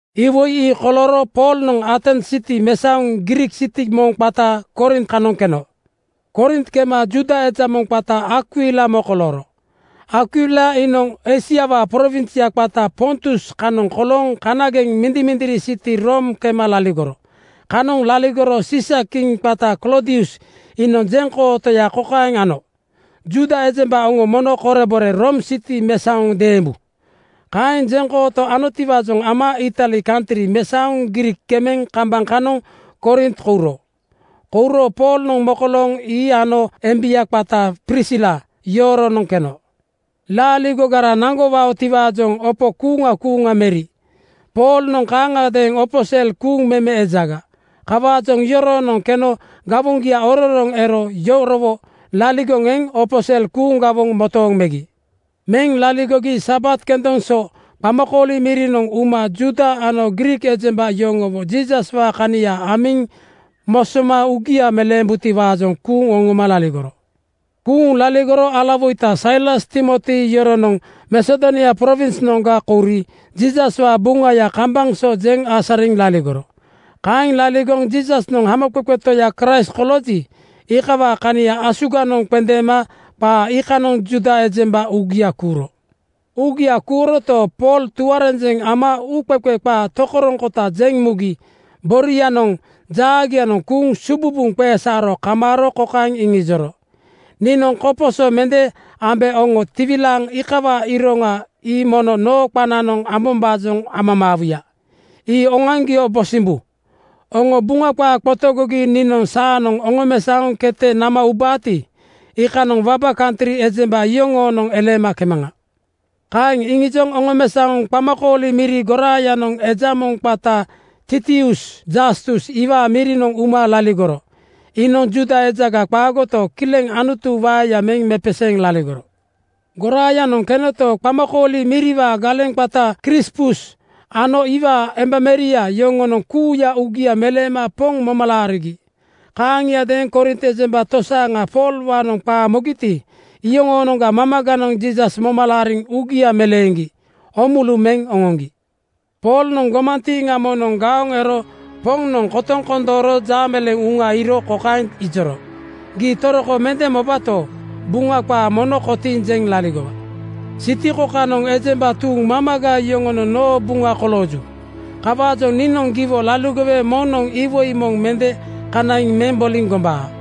Iwoi ii kolooro Poolnoŋ Atens siti mesaoŋ Griik siti moŋ qata Korint kanoŋ keno. Korint kema Juuda eja moŋ qaya Akwila mokolooro. Akwila iinoŋ Eisiawaa prowinsya qata Pontus kanoŋ kolooŋ kanageŋ mindimindiri siti Room kema laligoro. Kanoŋ laligoro Siisakiŋ qata Kloodius iinoŋ jeŋkootoya kokaeŋ ano, “Juuda ejemba oŋo mono korebore Room siti mesaoŋ deembu.” Kaeŋ jeŋkooto anotiwaajoŋ ama Itali kantri mesaoŋ Griik kemeŋ kambaŋ kanoŋ Korint kouro. Kouro Poolnoŋ mokolooŋ ii ano embia qata Prisila yoroonoŋ keno. Laaligogara naŋgowaotiwaajoŋ opo kuuŋa kuuŋa meri. Poolnoŋ kaaŋagadeeŋ opo sel kuuŋ meme ejaga. Kawaajoŋ yoroonoŋ keno gawoŋgia ororoŋ ero yorowo laligoŋ eŋ opo sel kuuŋ gawoŋ motooŋ megi. Meŋ laligogi Sabat kendoŋ so qamakooli mirinoŋ uma Juuda ano Griik ejemba yoŋowo Jiisaswaa kania amiŋ mosoma uugia meleembutiwaajoŋ kuuŋ oŋoma laligoro. Kuuŋ laligoro alawoita Sailas Timoti yoronoŋ Masedonia prowinsnoŋga kouri Jiisaswaa Buŋaya kambaŋ so jeŋ asariŋ laligoro. Kaeŋ laligoŋ Jiisasnoŋ Hamoqeqe Toya Kraist kolooji, iikawaa kania asuganoŋ qendeema qaa iikanoŋ Juuda ejemba uugia kuuro. Uugia kuuroto, Pool tuarenjeŋ ama uuqeqe qaa tokoroŋkota jeŋ mugi borianoŋ jaagianoŋ kuuŋ sububuŋ qesaaro kamaaro kokaeŋ iŋijoro, “Niinoŋ koposo mende ambe oŋo tiwilaaŋ iikawaa iroŋa ii mono noo qananoŋ ambombaajoŋ amamaawuya. Ii oŋoaŋgio bosimbu. Oŋo Buŋa qaa qotogogi niinoŋ saanoŋ oŋomesaoŋ kete nama ubaati, iikanoŋ waba kantri ejemba yoŋoonoŋ eleema kemaŋa.” Kaeŋ iŋijoŋ oŋomesaoŋ qamakooli miri goraayanoŋ eja moŋ qata Titius Jastus iwaa mirinoŋ uma laligoro. Iinoŋ Juuda ejaga qaagoto, kileŋ Anutuwaa waeya meŋ mepeseeŋ laligoro. Goraayanoŋ kenoto, qamakooli miriwaa galeŋ qata Krispus ano iwaa embameria yoŋonoŋ kuuya uugia meleema Poŋ moma laarigi. Kaaŋiadeeŋ Korint ejemba tosaaŋa Poolwaanoŋ qaa mogiti, iyoŋoonoŋga mamaganoŋ Jiisas moma laariŋ uugia meleeŋgi oomulu meŋ oŋoŋgi. Poolnoŋ gomantiiŋa moŋnoŋ gaoŋ ero Poŋnoŋ kotoŋ kondooro jaameleeŋ uŋa iiro kokaeŋ ijoro, “Gii toroko mende mobato, Buŋa qaa mono kotiiŋ jeŋ laligowa. Siti kokanoŋ ejemba tuuŋ mamaga yoŋonoŋ noo buŋa kolooju. Kawaajoŋ niinoŋ giwo laligowe moŋnoŋ iwoi moŋ mende kanaiŋ meŋ boliŋ gombaa.”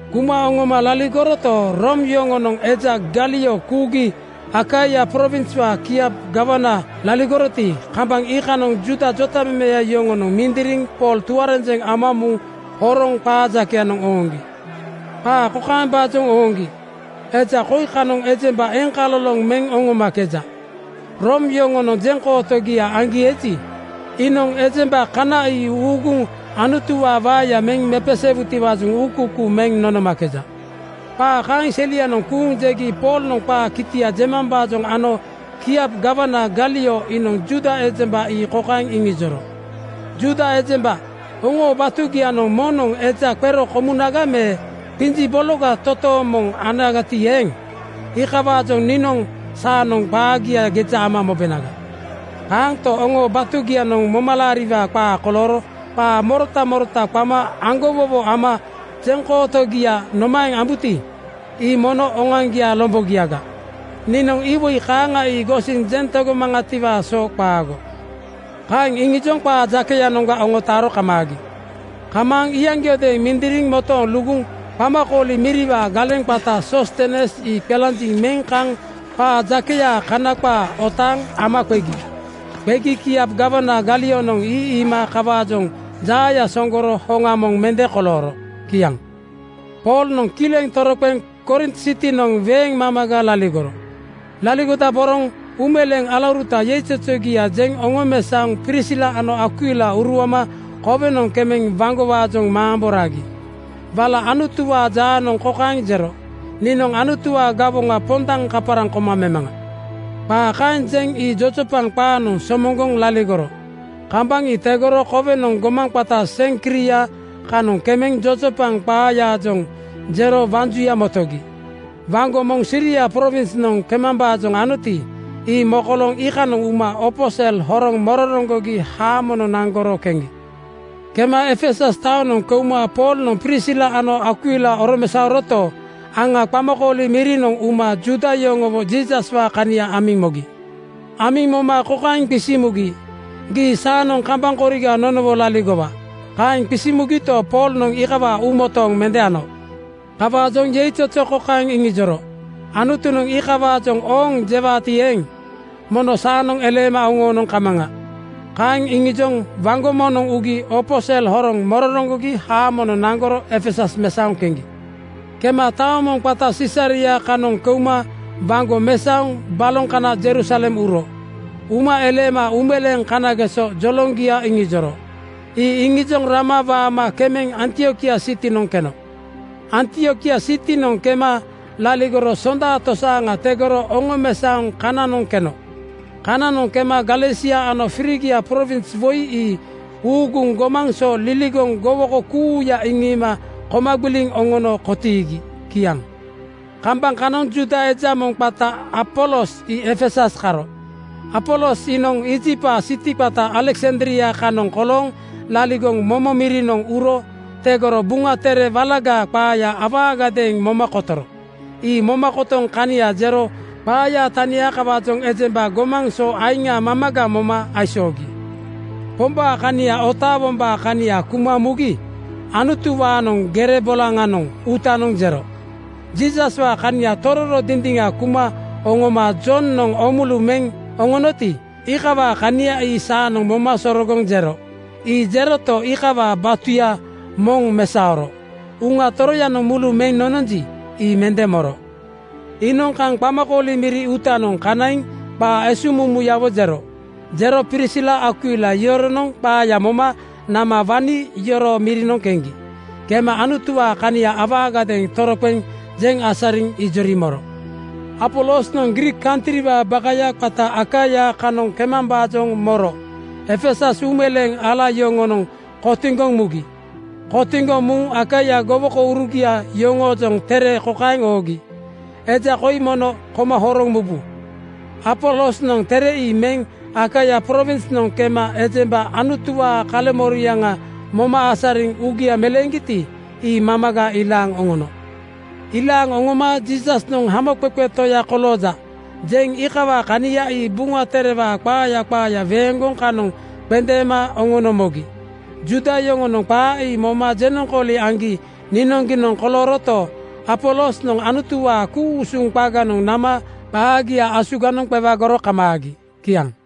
Kuma oŋoma laligoroto, Room yoŋonoŋ eja Galio kuugi Akaia prowinswaa kiap gawana laligoroti, kambaŋ iikanoŋ Juuda jotamemeya yoŋonoŋ mindiriŋ Pool tuarenjeŋ ama muŋ horoŋ qaa jakeyanoŋ ooŋgi. Qaa kokaembaajoŋ ooŋgi, “Eja koi kanoŋ ejemba eŋkaloloŋ meŋ oŋomakeja. Room yoŋonoŋ jeŋkootogia aŋgi eji, iinoŋ ejemba kana ii uuguŋ Anutuwaa waeya meŋ mepeseewutiwaajoŋ uukuukuu meŋ nonomakeja.” Qaa kaeŋ selianoŋ kuuŋ jegi Poolnoŋ qaa kitia jemambaajoŋ ano kiap gawana Galio iinoŋ Juuda ejemba ii kokaeŋ iŋijoro, “Juuda ejemba oŋoo batugianoŋ moŋnoŋ eja qero komunaga me qinji bologa totooŋ moŋ anagati eeŋ, iikawaajoŋ niinoŋ saanoŋ qaagia geja ama mobenaga. Kaanto, oŋoo batugianoŋ momalaariwaa qaa kolooro qa morota morota qama aŋgowowo ama jeŋkootogia nomaeŋ ambuti, ii mono oŋoaŋgiaa lombogiaga. Niinoŋ iwoi kaaŋa ii gosiŋ jeŋ tegomaŋatiwaa so qaago.” Kaeŋ iŋijoŋ qaa jakeyanoŋga oŋotaaro kamaagi. Kamaaŋ iyaŋgiodeeŋ mindiriŋ motooŋ luguŋ qamakooli miriwaa galeŋ qata Soostenes ii qelanjiŋ meŋ kaŋ qaa jakeyaa kana qaa ootanoŋ ama qegi. Qegi kiap gawana Galionoŋ ii iima kawaajoŋ jaaya sooŋgoro hoŋa moŋ mende kolooro. Kiaŋ. Poolnoŋ kileŋ toroqeŋ Korint sitinoŋ weeŋ mamaga laligoro. Laligodaboroŋ uumeleeŋ alauruta yeizozogia jeŋ oŋomesaoŋ Prisila ano Akwila uruama kowenoŋ kemeŋ waŋgowaajoŋ mamboma ragi. Wala Anutuwaa jaanoŋ kokaeŋ jero, “Niinoŋ Anutuwaa gawoŋa pondaŋ kaparaŋ koma memaŋa.” Qaa kaeŋ jeŋ ii jojopaŋ qaanoŋ somoŋgoŋ laligoro. Kambaŋ ii tegoro kowenoŋ gomaŋ qata Seŋkria kanoŋ kemeŋ jojopaŋ qaayaajoŋ jero waŋ juya motogi. Waŋgo moŋ Siria prowinsnoŋ kemambaajoŋ anoti, ii mokolooŋ iikanoŋ uma opo sel horoŋ mororoŋgogi haamonoŋ naŋgoro keŋgi. Kema Efesus taonoŋ keuma Poolnoŋ Prisila ano Akwila oromesaoroto, aŋa qamakooli mirinoŋ uma Juuda yoŋowo Jiisaswaa kania amiŋ mogi. Amiŋ moma kokaeŋ qisiŋ mugi, “Gii saanoŋ kambaŋ koriga nonowo laligowa.” Kaeŋ qisiŋ mugito, Poolnoŋ iikawaa uumotooŋ mende ano. Kawaajoŋ yeizozo kokaeŋ iŋijoro, “Anutunoŋ iikawaajoŋ ‘Ooŋ,’ jewaati eeŋ, mono saanoŋ eleema oŋoonoŋ kamaŋa.” Kaeŋ iŋijoŋ waŋgo moŋnoŋ ugi opo sel horoŋ mororoŋgogi haamonoŋ naŋgoro Efesus mesaoŋ keŋgi. Kema taoŋ moŋ qata Sisaria kanoŋ keuma waŋgo mesaoŋ baloŋ kana Jerusalem uro. Uma eleema uumeleeŋ kanageso joloŋgia iŋijoro. Ii iŋijoŋ rama waama kemeŋ Antiokia sitinoŋ keno. Antiokia sitinoŋ kema laligoro sonda tosaaŋa tegoro oŋomesaoŋ kananoŋ keno. Kananoŋ kema Galesia ano Frigia prowins woi ii uuguŋ gomaŋ so liligoŋ gowoko kuuya iŋiima koma gbiliŋ oŋono kotiigi. Kiaŋ. Kambaŋ kanoŋ Juuda eja moŋ qata Apolos ii Efesus karo. Apolos iinoŋ Iijiptwaa siti qata Aleksandria kanoŋ kolooŋ laligoŋ momo mirinoŋ uro tegoro Buŋa Tere Walagaa qaaya awaagadeeŋ moma kotoro. Ii moma kotoŋ kania jero qaayaa tania kawaajoŋ ejemba gomaŋ so aiŋa mamaga moma aisoogi. Pombaa kania otaawombaa kania kuma mugi Anutuwaanoŋ gere bolaŋanoŋ uutanoŋ jero. Jiisaswaa kania tororo dindiŋa kuma oŋoma Jonoŋ oomulu meŋ oŋonoti, iikawaa kania saanoŋ moma sorogoŋ jero. Ii jeroto, iikawaa batuya moŋ mesaoro. Uŋa Toroyanoŋ mulu meŋ nononji, ii mende moro. Iinoŋ kaŋ qamakooli miri uutanoŋ kanaiŋ qaa esuŋmumu-yawo jero. Jero Prisila Akwila yoronoŋ qaaya moma nama wani yoroo mirinoŋ keŋgi. Kema Anutuwaa kania awaagadeeŋ toroqeŋ jeŋ asariŋ ijori moro. Apolosnoŋ Griik kantriwaa bakaya qata Akaia kanoŋ kemambaajoŋ moro Efesus uumeleeŋ ala yoŋonoŋ kotiŋgoŋ mugi. Kotiŋgoŋ muŋ Akaia gowokourugia yoŋoojoŋ tere kokaeŋ oogi, “Eja koi mono koma horoŋ mubu.” Apolosnoŋ tere ii meŋ Akaia prowinsnoŋ kema ejemba Anutuwaa kaleŋmoriaŋa moma asariŋ uugia meleeŋgiti, ii mamaga ilaaŋ oŋono. Ilaaŋ oŋoma “Jiisasnoŋ Hamoqeqe Toya kolooja,” jeŋ iikawaa kania ii Buŋa Terewaa qaaya qaaya weeŋgoŋ kanoŋ qendeema oŋono mogi. Juuda yoŋonoŋ qaa ii moma jenoŋkooli aŋgi niinoŋgiinoŋ kolooroto, Apolosnoŋ Anutuwaa ku-usuŋ qaganoŋ nama qaagia asuganoŋ qewagoro kamaagi. Kiaŋ.